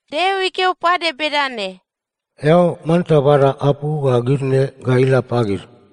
Deo ikeo pade bedane, “Eao manta bada apu ga gid ne ga ila pagid: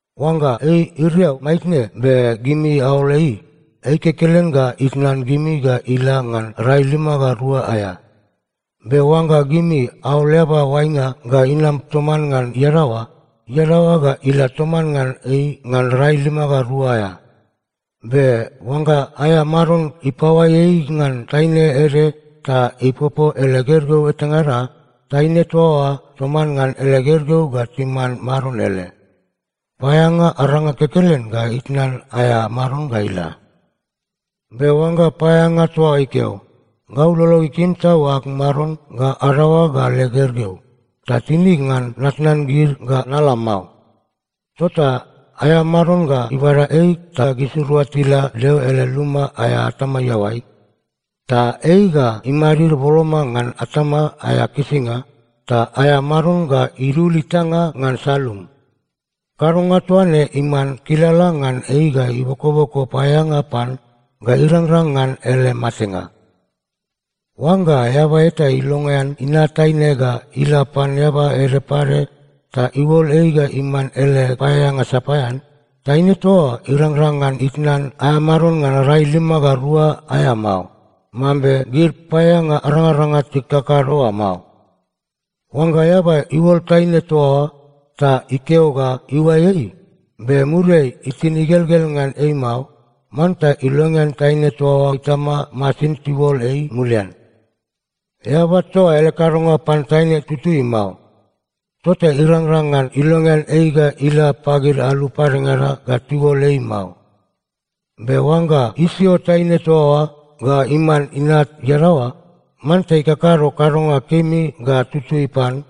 Oangga ei iriau maitne be gimi aol ei, ei kekelen ga itnan gimi ga ila ngan rai lima ga rua aea. Be oangga gimi aol eaba oainga ga inam toman ngan iadaoa, iadaoa ga ila toman ngan ei ngan rai lima ga rua aea. Be oangga aea maron ipaoai ei ngan taine ede ta ipopo ele gergeu etangada, taine toa oa toman ngan ele gergeu ga timan maron ele. Paeaeanga aranga kekelen ga itnan aea maron ga ila. “Be oangga paeaeanga toa oa ikeo, ‘Gau lolog ikim tau ag maron ga adaoag ga leg gergeu, ta tinig ngan natnan gid ga nala mao,’ tota aea maron ga ibada ei ta gisirua tila Deo ele luma aea atama iaoai. Ta ei ga imadid boloma ngan atama aea kisinga, ta aea maron ga idul itanga ngan salumu. Kadonga toa ne iman kilala ngan ei ga ibokoboko paeaeanga pan ga irangrang ngan ele matenga. “Oangga eaba eta ilongean inat taine ga ila pan eaba ede pade ta iuol ei ga iman ele paeaeanga sapaean, taine toa oa irangrang ngan itnan aea maron ngan rai lima ga rua aea mao, mambe gid paeaeanga arangaranga tikakado oa mao. Oangga eaba iuol taine toa oa ta ikeo ga iuai ei, be muriai itin igelgel ngan ei mao, manta ilongean taine toa oa itama masin tiuol ei mulian. Eaba toa oa ele kadonga pan taine itutui mao, tota irangrang ngan ilongean ei ga ila pagid alu padengada ga tiuol ei mao. Be oangga isio taine toa oa ga iman inat iadaoa, manta ikakado kadonga kemi ga tutui pan,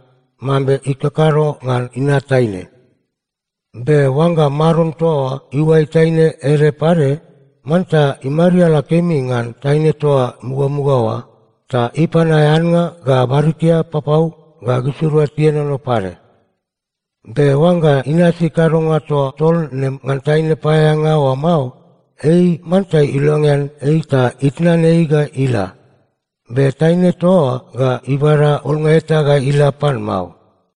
mambe ikakado ngan inat taine. Be oangga maron toa oa iuai taine ede pade, manta imariala kemi ngan taine toa mugamuga oa, ta ipan aea annga ga barikia papau ga gisirua tienono pade. Be oangga inasi kadonga toa tol ne ngan taine paeaeanga oa mao, ei manta ilongean ei ta itnan ei ga ila. Be taine toa oa ga ibada olnga eta ga ila pan mao.”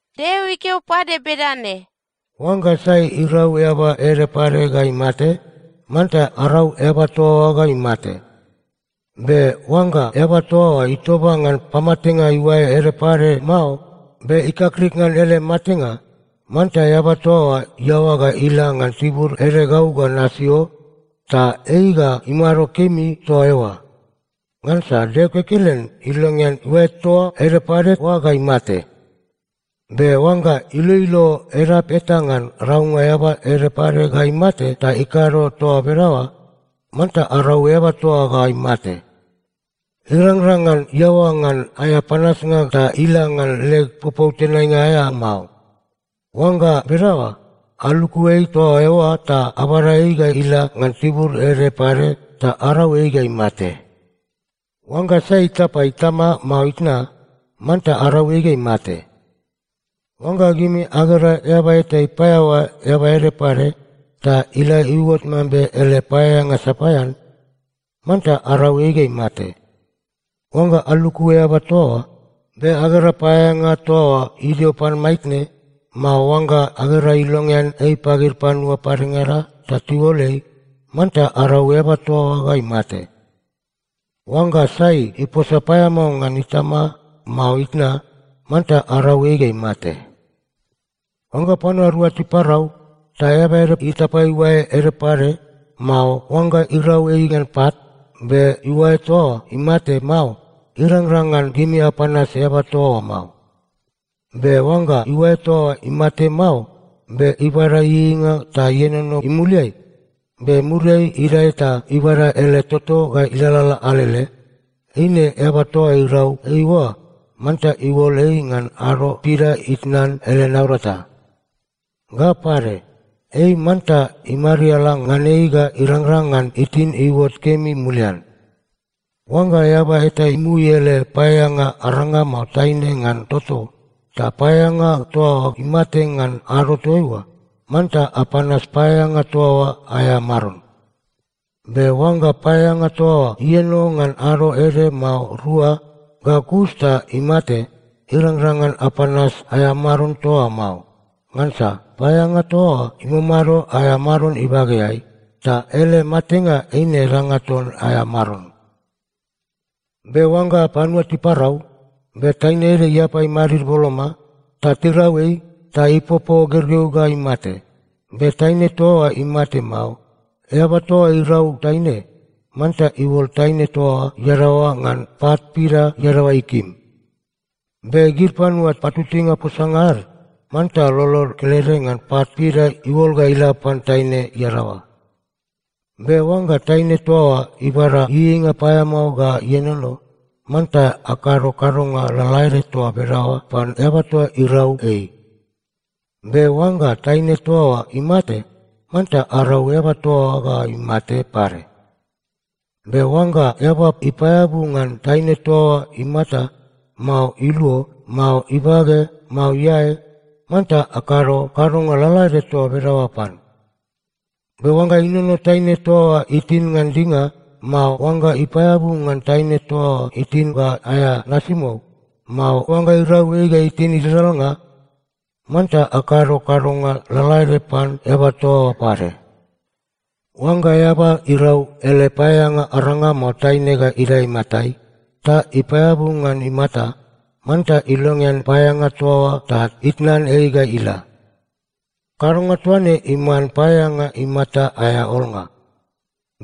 Deo ikeo pade bedane, “Oangga sai irau eaba ede pade ga imate, manta arau eaba toa oa ga imate. Be oangga eaba toa oa itoba ngan pamatenga iuae ede pade mao, be ikakrik ngan ele matenga, manta eaba toa oa iaoa ga ila ngan tibur ede gau ga nasio, ta ei ga imado kemi toa eoa. Ngansa Deo kekelen ilongean iuae toa ede pade oa ga imate. Be oangga iloilo edap eta ngan raunga eaba ede pade ga imate ta ikado toa bedaoa, manta arau eaba toa oa ga imate. Irangrang ngan iaoa ngan aea panasnga ta ila ngan leg popou tenainga aea mao. Oangga bedaoa, aluku ei toa eoa ta abada ei ga ila ngan tibur ede pade ta arau ei ga imate. “Oangga sai itapa itama mao itna, manta arau ei ga imate. “Oangga gimi agera eaba eta ipaeaoa eaba ede pade, ta ila iuot mambe ele paeaeanga sapaean, manta arau ei ga imate. Oangga aluku eaba toa oa, be agera paeaeanga toa oa idio pan maitne, mao oangga agera ilongean ei pagid panua padengada ta tiuol ei, manta arau eaba toa oa ga imate. “Oangga sai iposa paeamao ngan itama mao itna, manta arau ei ga imate. “Oangga panua rua tiparau, ta eaba ede itapa iuae ede pade, mao oangga irau ei ngan pat, be iuae toa oa imate mao, irangrang ngan gimi apanas eaba toa oa mao. Be oangga iuae toa oa imate mao, be ibada ieieinga ta ienono imuliai, be muriai idae ta ibada ele toto ta ilalala alele, eine eaba toa irau ei oa manta iuol ei ngan ado pida itnan ele naurata. Ga pade, ei manta imariala ngan ei ga irangrang ngan itin iuot kemi mulian. “Oangga eaba eta imui ele paeaeanga aranga mao taine ngan toto, ta paeaeanga toa oa imate ngan ado toaiua, manta apanas paeaeanga toa oa aea maron. Be oangga paeaeanga toa oa ieno ngan ado ede mao rua, ga kus ta imate, irangrang ngan apanas aea maron toa oa mao. Ngansa paeaeanga toa oa imamado aea maron ibageai, ta ele matenga eine danga ton aea maron. “Be oangga panua tiparau, be taine ede iapa imadid boloma, ta tirau ei, ta ipopo gergeu ga imate, be taine toa oa imate mao, eaba toa irau taine, manta iuol taine toa oa iadaoa ngan pat pida iadaoa ikim. Be gid panua patutuinga posanga ad, manta lolod kelede ngan pat pida iuol ga ila pan taine iadaoa. Be oangga taine toa oa ibada ieieinga paeamao ga ienono, manta akado kadonga lalaede toa bedaoa pan eaba toa irau ei. Be oangga taine toa oa imate, manta arau eaba toa oa ga imate pade. Be oangga eaba ipaeabu ngan taine toa oa imata, mao iluo, mao ibage, mao iae, manta akado kadonga lalaede toa bedaoa pan. Be oangga inono taine toa oa itin ngan dinga, mao oangga ipaeabu ngan taine toa oa itin ga aea nasimou, mao oangga irau ei ga itin idadalnga, manta akado kadonga lalaede pan eaba toa oa pade. “Oangga eaba irau ele paeaeanga aranga mao taine ga idae imatai, ta ipaeabu ngan imata, manta ilongean paeaeanga toa oa ta itnan ei ga ila. Kadonga toa ne iman paeaeanga imata aea olnga.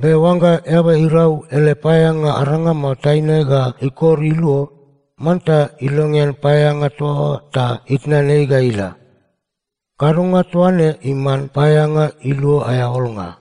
Be oangga eaba irau ele paeaeanga aranga mao taine ga ikor iluo, manta ilongean paeaeanga toa oa ta itnan ei ga ila. Kadonga toa ne iman paeaeanga iluo aea olnga.”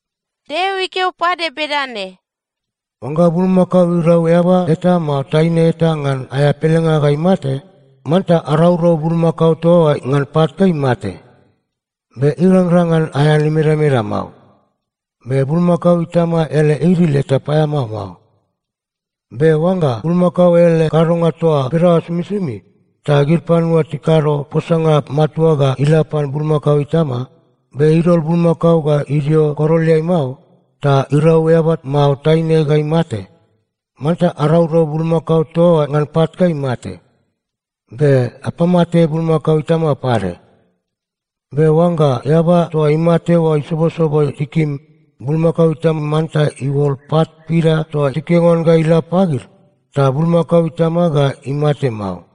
Deo ikeo pade bedane, “Oangga bulmakao irau eaba eta mao taine eta ngan aea pelenga ga imate, manta araurau bulmakao toa oa ngan pat ga imate. Be irangrang ngan aean imedameda mao. Be bulmakao itama ele idil eta paeamao mao. Be oangga bulmakao ele kadonga toa bedaoa somisomi, ta gid panua tikado posanga matua ga ila pan bulmakao itama, be idol bulmakao ga idio koroleai mao, ta irau eaba mao taine ga imate, manta araurau bulmakao toa oa ngan pat ga imate. Be apamate bulmakao itama pade. Be oangga eaba toa imate oa isobosobo tikim, bulmakao itama manta iuol pat pida toa tikeo ngan oa ga ila pagid, ta bulmakao itama ga imate mao.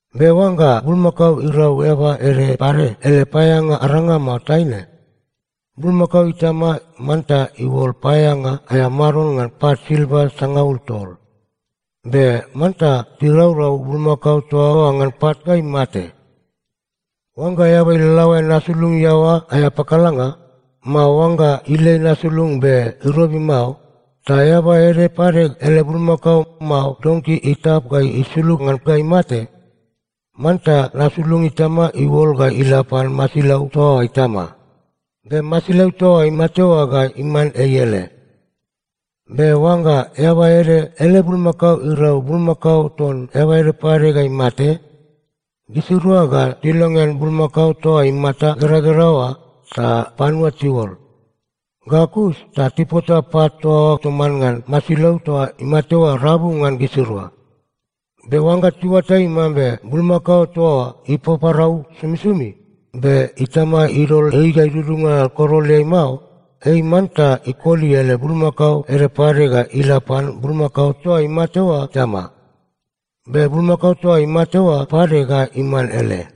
Be oangga bulmakao irau eaba ede pade ele paeaeanga aranga mao taine, bulmakao itama manta iuol paeaeanga aea maron ngan pat silva sangaul tol. Be manta tiraurau bulmakao toa oa ngan pat ga imate. “Oangga eaba ilalaoan nasulung iaoa aea pakalanga, mao oangga ilei nasulung be irobi mao, ta eaba ede pade ele bulmakao mao donki itap ga isulug ngan ga imate, manta nasulung itama iuol ga ila pan masilau toa oa itama. Be masilau toa imate oa ga iman ei ele. “Be oangga eaba ede ele bulmakao irau bulmakao ton eaba ede pade ga imate, gisirua ga tilongean bulmakao toa imata igeragera oa ta panua tiuol. Ga kus ta tipota pat toa oa toman ngan masilau toa imate oa rabu ngan gisirua. Be oangga tiuatai mambe bulmakao toa oa ipaparau somisomi, be itama idol ei ga idudunga koroleai mao, ei manta ikoli ele bulmakao ede pade ga ila pan bulmakao toa imate oa itama. Be bulmakao toa imate oa pade ga iman ele.”